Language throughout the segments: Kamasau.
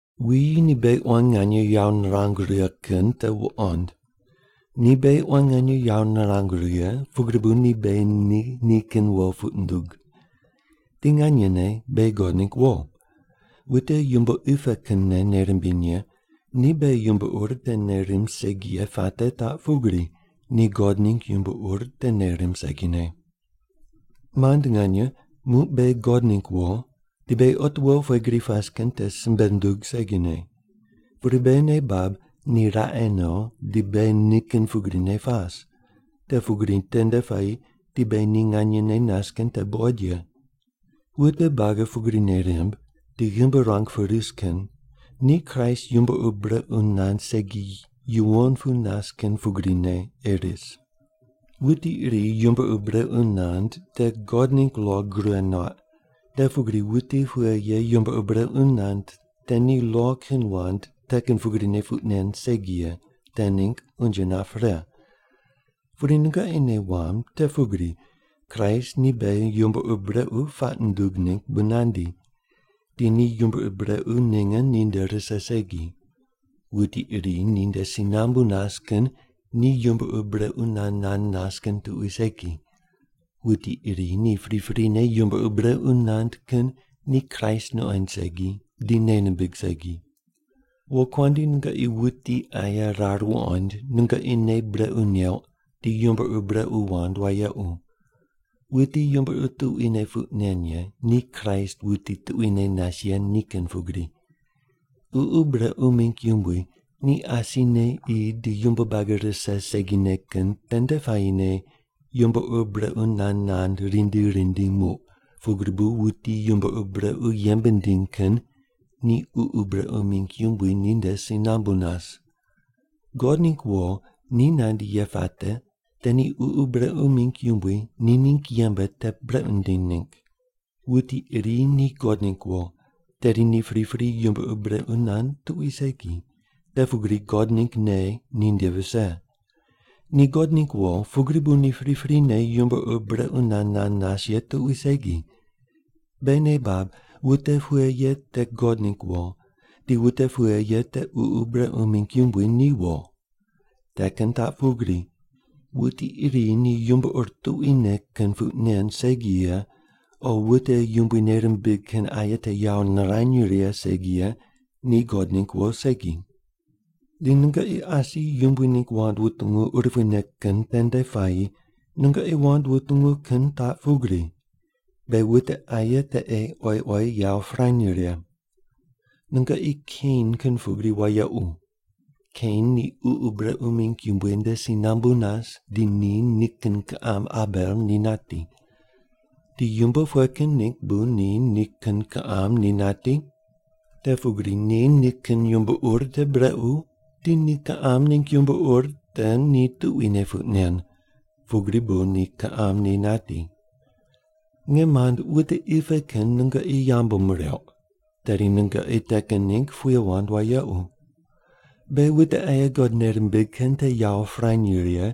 Wuyi ni beghi quan nganye yawo nirangu righe kin te wuqond! Ni beghi quan nganye yawo nirangu righe, pugri bu ni beghi ni nikin wo puq nundug. Di nganyene beghi God ningg wo. Wute yumbo qi pe kinne nei rimbiny ye ni beghi yumbo ur te nei rimb segi ye puate taq pugri, ni God ningg yumbo ur te nei rimb segine. Mand nganye, muq beghi God ningg wo, di beghi otiwo pughe gri pas kin te simbe nundug segine. Pudi beghi nei bab ni raqe no di beghi nikin pugrine pas, te pugri tende puayi di beghi ni nganyene nas kin te buqoid ye. Wute buagi pugri nei rimb di ghimbi ruang pu ris kin ni Kraist yumbo ur brequ nand segi yuwon pu nas kin pugrine ei ris. Wuti iri yumbo ur brequ nand te God ningg lo gure nuaq, te pugri wuti pughe ye yumbo ur brequ nand te ni lo kin wand te kin pugrine puq nen segi ye te ningg unje nap pre. Pudi nungoqi nei wamb te pugri Kraist ni beghi yumbo ur brequ puaq nundug ningg bu nandi, di ni yumbo ur brequ ninge ninde rise segi. Wuti iri ninde si nambu nas kin ni yumbo ur brequ nand nand nas kin tuqui segi. Wuti iri ni priprine yumbo ur brequ nand kin ni Kraist nuqoind segi di nei nimbig segi. Wokuandi, nungoqi wuti aye rar wuqoind nungoqi nei brequ neuq di yumbo ur brequ wand wayequ. Wuti yumbo ur tuquine puq nen ye, ni Kraist wuti tuquine nas ye ni kin pugri. Ququ brequ mingg yumbui ni asine qi di yumbo buagi rise segine kin tende puayine yumbo ur brequ nand nand rindi rindi muq, pugri bu wuti yumbo ur brequ yembe nindiny kin ni ququ brequ mingg yumbui ninde si nambu nas. God ningg wo ni nandi ye puate te ni ququ brequ mingg yumbui ni ningg yembe te brequ nindiny ningg. Wuti iri ni God ningg wo, tedi ni pripri yumbo ur brequ nand tuqui segi, te pugri God ningg nei ninde vise. Ni God ningg wo, pugri bu ni priprine yumbo ur brequ nand nand nas ye tuqui segi. Beghi nei bab wute pughe ye te God ningg wo, di wute pughe ye te ququ brequ mingg yumbui ni wo. Te kin taq pugri: Wuti iri ni yumbo ur tuquine kin puq nen segi ye, o wute Yumbui nei rimbig kin aye te yawo nirany righe segi ye ni God ningg wo segi. Di nungoqi asi Yumbui ningg wand wutungu urupuine kin tende puayi nungoqi wand wutungu kin taq pugri: Beghi wute aye te ei oyi oyi yawo pirany righe. Nungoqi Kein kin pugri wayequ. Kein ni ququ brequ mingg yumbui nde si nambu nas di ni nikin kiqam Abel ni nati. Di yumbo pughe kin ningg bu ni nikin kiqam ni nati? Te pugri ni nikin yumbo ur te brequ, di ni kiqam ningg yumbo ur te ni tuquine puq nen, pugri bu ni kiqam ni nati. Nge mand, wute qi pe kin nungoqi yambu mireuq, tedi nungoqi te kin ningg puye wand wayequ. Beghi wute aye God nei rimbig kin te yawo pirany righe,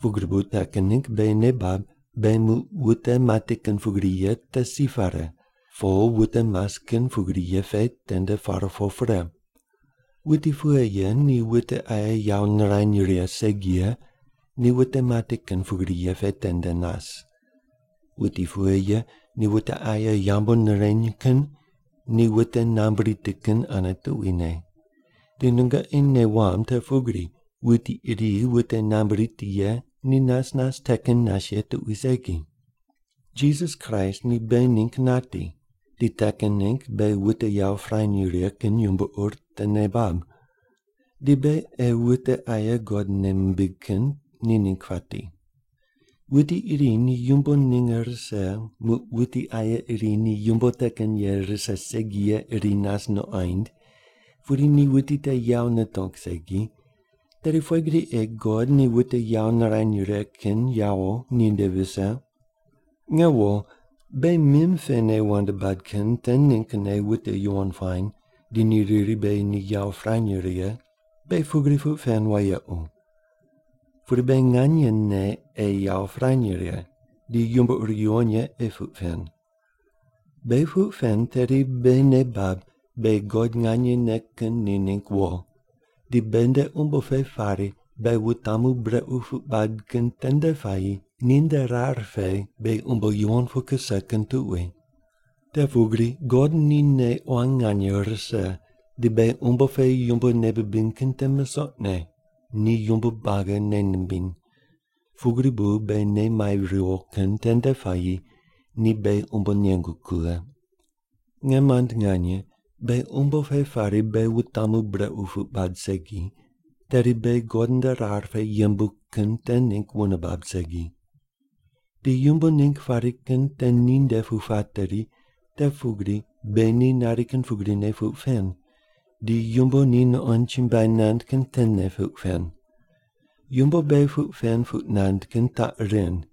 pugri bu te kin ningg beghi nei bab beghi muq wute mati kin pugri ye te si pare, po wute mas kin pugri ye pe tende par po pre. Wuti pughe ye ni wute aye yawo nirany righe segi ye, ni wute mati kin pugri ye pe tendene nas. Wuti pughe ye ni wute aye yambu nireny kin ni wute nambui riti kin ane tuquine. Di nungoqi nei wamb te pugri wuti iri wute nambui riti ye ni nas nas te kin nas ye tuqui segi. Jisas Kraist ni beghi ningg nati, di te kin ningg beghi wute yawo pirany righe kin yumbo ur te nei bab. Di beghi ei wute aye God nei mimbig kin ni ningg pati. Wuti iri ni yumbo ninge rise, muq wuti aye iri ni yumbo te kin ye rise segi ye iri nas nuqoind, pudi ni wuti te yawo nitong segi, tedi pughe gri ei God ni wute yawo nirany righe kin yawo ninde vise? Nge wo, beghi mim pene wand bad kin te ninggne wute yuwon puany di ni riri beghi ni yawo pirany righe; beghi pugri puq pen wayequ. Pudi beghi nganyene ei yawo pirany righe, di yumbo ur yuwon ye ei puq pen. Beghi puq pen tedi beghi nei bab beghi God nganyene kin ni ningg wo, di beghi nde umbo pe pari beghi wutamu brequ puq bad kin tende puayi ninde rar pe beghi umbo yuwon pu kuse kin tuqui. Te pugri God ni nei quan nganye rise di beghi umbo pe yumbo nei bibiny kin te misoqne, ni yumbo buagi nei nimbiny. Pugri bu beghi nei mai riwo kin tende puayi ni beghi umbo nengu kughe. Nge mand nganye, beghi umbo pe pari beghi wutamu brequ puq bad segi, tedi beghi God nde rar pe yembu kin te ningg wune bab segi. Di yumbo ningg pari kin te ninde pu pateri, te pugri beghi ni nari kin pugrine puq pen, di yumbo ni nuqond chumbuai nand kin tene puq pen. Yumbo beghi puq pen puq nand kin taq ren: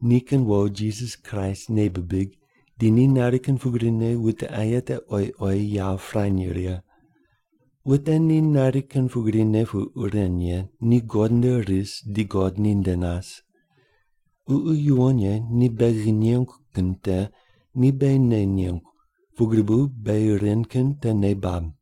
Nikin wo Jisas Kraist nei bibig, di ni nari kin pugrine wute aye te oyi oyi yawo pirany righe. Wute ni nari kin pugrine puq ren ye ni God nde ris di God ninde nas. Ququ Yuwon Ye ni beghi nengu kin te ni beghi nei nengu, pugri bu beghi ren kin te nei bab.